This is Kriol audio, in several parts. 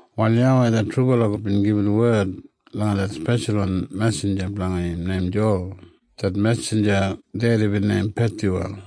Wal YAWEI det trubala God bin gibit wed langa det speshalwan mesinja blanga im neim Jowal. Det mesinja dedi bin neim Pethyuwel.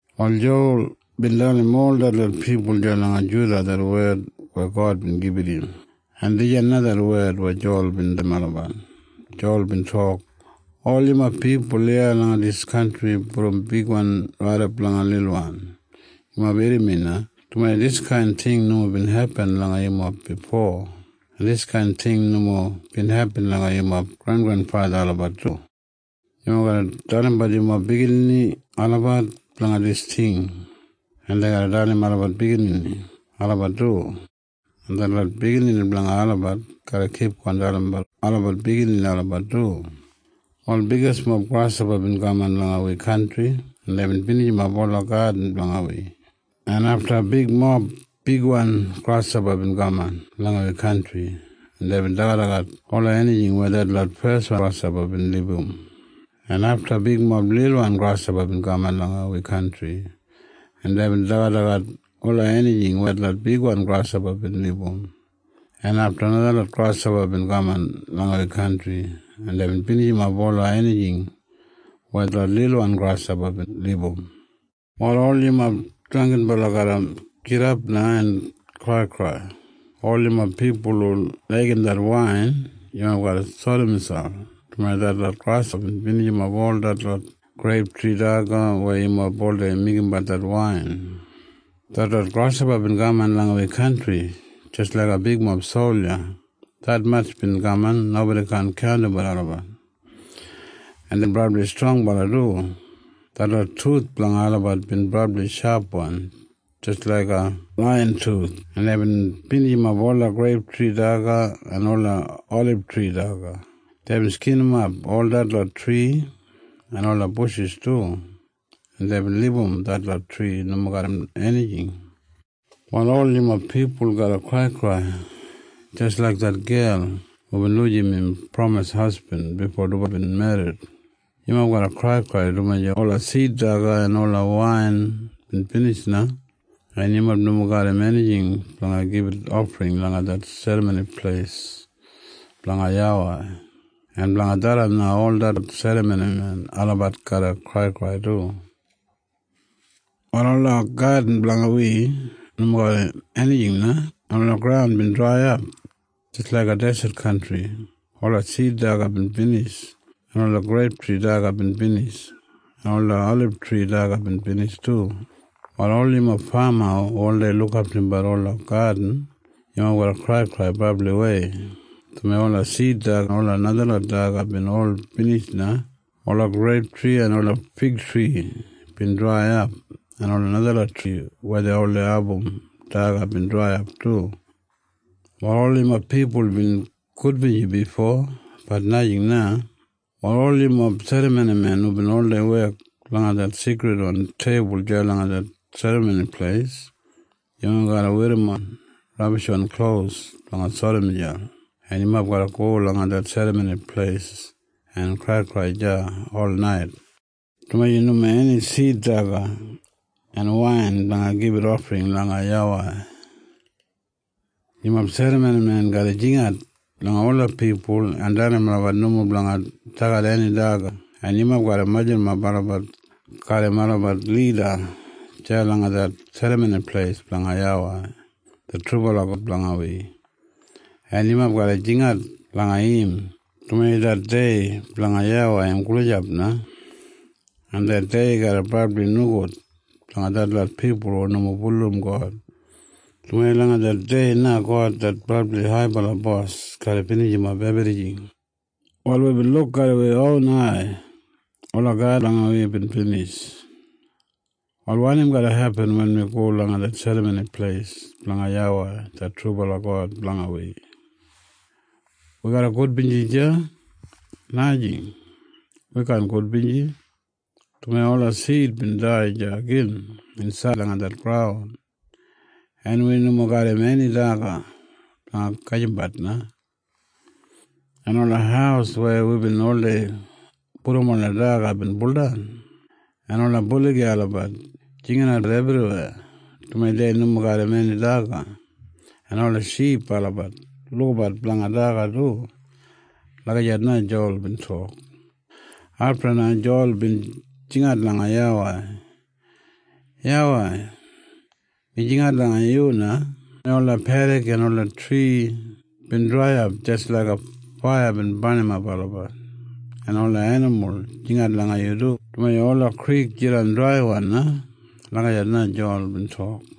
Wal Jowal bin dalim ol detlot pipul deya langa Juda det wed weya God bin gibit im, en dijan na det wed weya Jowal bin dalim olabat. Jowal bin tok, “Ol yumob pipul iya langa dis kantri brom bigwan raidap langa lilwan, yumob irrim mi na, dumaji diskain ting nomo bin hepin langa yumob bifo. En diskain ting nomo bin hepin langa yumob grengrenfatha olabat du. Yumob garra dalimbat yumob biginini olabat blanga dis ting, en dei garra dalim olabat biginini olabat du, en detlot biginini blanga olabat garra kipgon dalimbat olabat biginini olabat du. “Wal bigismob grashopa bin kaman langa wi kantri, en deibin binijimap ola gadin blanga wi. En afta bigmob bigwan grashopa bin kaman langa wi kantri, en deibin dagadagat ola enijing weya detlot feswan grashopa bin libum. En afta bigmob lilwan grashopa bin kaman langa wi kantri, en deibin dagadagat ola enijing weya detlot bigwan grashopa bin libum. En afta najalot grashopa bin kaman langa wi kantri, en deibin binijimap ola enijing weya detlot lilwan grashopa bin libum. “Wal ol yumob drangginbala garra gidap na en kraikrai. Ol yumob pipul hu laigim det wain, yumob garra sori miselp, dumaji detlot grashopa bin binijimap ol detlot greiptri daga weya yumob oldei meigimbat det wain. “Detlot grashopa bin kaman langa wi kantri jis laiga bigmob solja. Detmatj bin kaman nobodi kaan kaundimbat olabat. En deibin brabli strongbala du. Detlot tuth blanga olabat bin brabli shapwan jis laiga laiyan tuth, en deibin binijimap ola greiptri daga en ola olibtri daga. Deibin skinimap ol detlot tri en ola bushis du, en deibin libum detlot tri nomo garram enijing. “Wal ol yumob pipul garra kraikrai jis laik det gel hubin lujim im pramis hasbin bifo dubala bin merrit. Yumob garra kraikrai, dumaji ola sid daga en ola wain bin binij na, en yumob nomo garram enijing blanga gibit ofring langa det Serramoni Pleis blanga YAWEI. En blanga tharran na ol detlot serramonimen olabat garra kraikrai du. “Wal ola gadin blanga wi nomo garram enijing na, en ola graun bin draiyap jis laiga deset kantri. Ola sid daga bin binij, en ola greiptri daga bin binij, en ola olibtri daga bin binij du. “Wal ol yumob fama hu oldei lukaftumbat ola gadin, yumob garra kraikrai brabliwei, dumaji ola sid daga en ola najalot daga bin ol binij na. Ola greiptri en ola figtri bin draiyap, en ola najalot tri weya dei oldei abum daga bin draiyap du. “Wal ol yumob pipul bin gudbinji bifo. Bat najing na. “Wal ol yumob serramonimen hu oldei wek langa det seikridwan teibul deya langa det Serramoni Pleis, yumob garra werrimon rabishwan klos blanga sori miselp, en yumob garra go langa det Serramoni Pleis en kraikrai deya olnait, dumaji nomo eni sid daga en wain blanga gibit ofring langa YAWEI. “Yumob serramonimen garra jingat langa ola pipul en dalim olabat nomo blanga dagat eni daga, en yumob garra majurrumap olabat garram olabat lida deya langa det Serramoni Pleis blanga YAWEI det trubala God blanga wi, en yumob garra jingat langa im, dumaji det dei blanga YAWEI im gulijap na. En det dei garra brabli nogud blanga detlot pipul hu nomo bulurrum God, dumaji langa det dei na God det brabli haibala bos garra binijimap ebrijing. “Wal wibin luk garram wi ron ai ola gadin blanga wi bin binij. Wal wanim garra hepin wen wi go langa det Serramoni Pleis blanga YAWEI det trubala God blanga wi? Wi garra gudbinji deya? Najing. Wi kaan gudbinji, dumaji ola sid bin dai deya gin insaid langa det graun, en wi nomo garram eni daga blanga gajimbat na. En ola haus weya wibin oldei pudum ola daga bin buldan. En ola buligi olabat jinginatbat ebriweya, dumaji dei nomo garram eni daga. En ola ship olabat lukabat blanga daga du.” Lagijat na Jowal bin tok. Afta na Jowal bin jingat langa YAWEI, “YAWEI, mi jingat langa yu na, dumaji ola pedik en ola tri bin draiyap jis laiga faiya bin barnimap olabat. En ola enimul jingat langa yu du, dumaji ola krik jidan draiwan na.” Lagijat na Jowal bin tok.